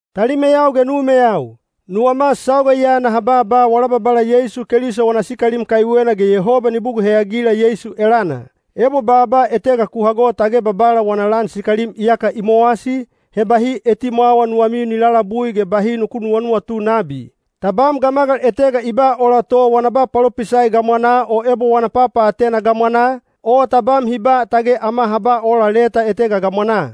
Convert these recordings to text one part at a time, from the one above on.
Talimeyau ge numeyau, nuwama sauga ya naha baaba wala Babala Yeisu Keliso wana sikalim kaiwena ge Yehoba ni bugul heyagila Yeisu elana. Ebo baaba etega ku hago tage Babala wana lan sikalim iyaka i mowasi, he bahi etimwawa nuwamiu ni lalabui ge bahi nuku nuwanuwatu nabi. Tabam gamagal etega i ba ola to wana ba palopisai gamwanaa o ebo wana papaatena gamwanaa, o tabam hi ba tage ama ha ba ola leta etega gamwanaa.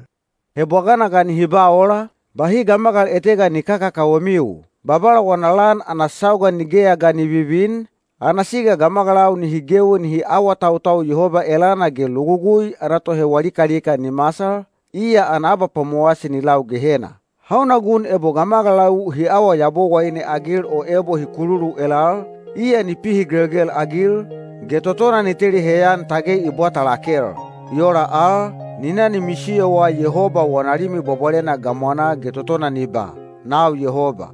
He bwagana ga nihi ba ola, bahi gamagal etega ni kakakawemiu. Babala wana lan ana sauga nigeya ga ni vivin, ana siga gamagalau nihi gewi nihi awatautau Yehoba elana ge logugui ana tohewa likalika ni masal, iya ana abapwamowasi ni lau Gehena. Hauna gun ebo gamagalau hi awa yabowaine-agil o ebo hi kululu elal, iya ni pihigelgel-agil, ge totona ni teli heyan tage i bwata lakel. I ola al, ni na ni misiyowa Yehoba wana Limi Bwabwalena gamwanaa ge totona ni ba, “Nau Yehoba.”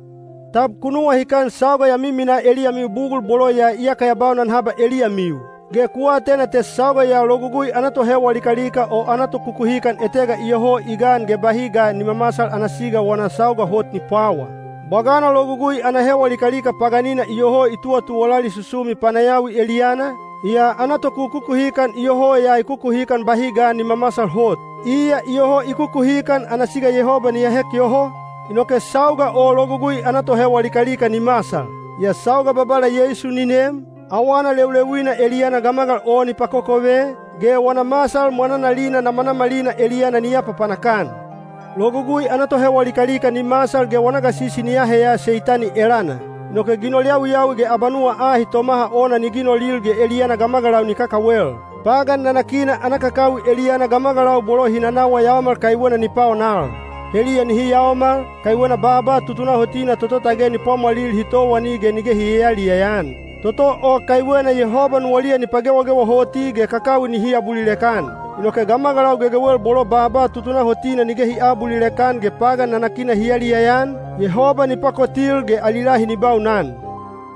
Tab ku nuwahikan sauga ya miminaa eliyamiu bugul bolo ya iyaka ya baunan haba eliyamiu? Ge ku atena te sauga ya logugui ana tohewa likalika o ana tokukuhikan etega iyoho i gan ge bahi ga ni mamasal ana siga wana sauga hot ni pwawa. Bwagana logugui ana hewa likalika paganina iyoho i tuwatuwalali susumi panayawi eliyana, yaa ana tokukukuhikan iyoho ya i kukuhikan bahi ga ni mamasal hot. Iya iyoho i kukuhikan ana siga Yehoba ni ahek yoho, inoke sauga o logugui ana tohewa likalika ni masal. Yaa sauga Babala Yeisu ni nem, awana leuleuina eliyana gamagal o ni pakokove, ge wana masal mwananalina namanamalina eliyana ni apapanak-an. Logugui ana tohewa likalika ni masal ge wana gasisi ni aheya Seitani elana. Inoke ginol yawiyawi ge abanuwa ahi tomaha ona ni ginolil ge eliyana gamagalau ni kakawel. Pagan nanakina ana kakakawi eliyana gamagalau bolo hi nanawa yaomal kaiwena ni paonal. Heliya nihi yaomal, kaiwena baaba tutunahotina toto tage ni pwamwalil hi towani ge nige hi yayaliyaya-an. Toto o kaiwena Yehoba nuwaliya ni pagewagewa hoti ge kakawi nihi abulilek-an. Inoke gamagalau gegewel bolo baaba tutunahotina nige hi aabulilek-an ge pagan nanakina hi yaliyaya-an, Yehoba ni pakotil ge ali lahi ni baunan.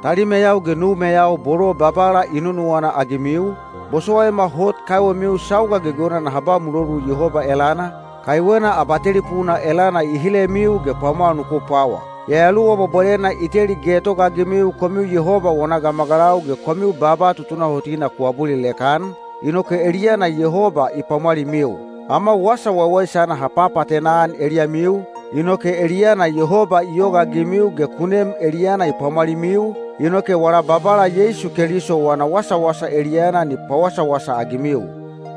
Talimeyau ge numeyau bolo Babala i nunuwana-agimiu, bosowaima hot kaiwemiu sauga gegewena naha ba mulolu Yehoba elana, kaiwena abatelipuna elana i hilemiu ge pwamwal nuku pwawa. Yayaluwa Bwabwalena i teli getogaagimiu komiu Yehoba wana gamagalau ge komiu baaba tutunahotina ku abulilek-an, inoke eliyana Yehoba i pwamwalimiu. Ama Wasa Waiwaisana ha papaatena-an eliyamiu, inoke eliyana Yehoba i yogaagimiu ge ku nem elana i pwamwalimiu, inoke wala Babala Yeisu Keliso wana wasawasa eliyana ni pawasawasa-agimiu.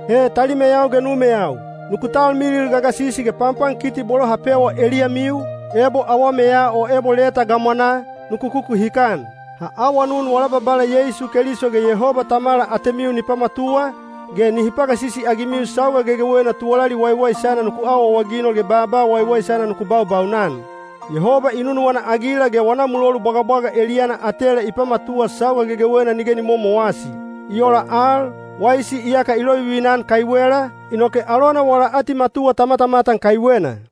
He talimeyau ge numeyau, nuku talmilil gagasisi ge panpankiti bolo ha pewa eliyamiu, ebo awameya o ebo leta gamwanaa, nuku kukuhikan. Ha awanun wala Babala Yeisu Keliso ge Yehoba Tamala atemiu nihi pamatuwa, ge nihi pagasisi-agimiu sauga gegewena tuwalali waiwaisana nuku awaawaginol ge baaba waiwaisana nuku baubaunan. Yehoba i nunuwana-agila ge wana mulolu bwagabwaga eliyana atela i pamatuwa sauga gegewena nige ni momowasi. I ola al, waisi iyaka i lovivina-an kaiwela, inoke alona wala atimatuwa ta matamatan kaiwena.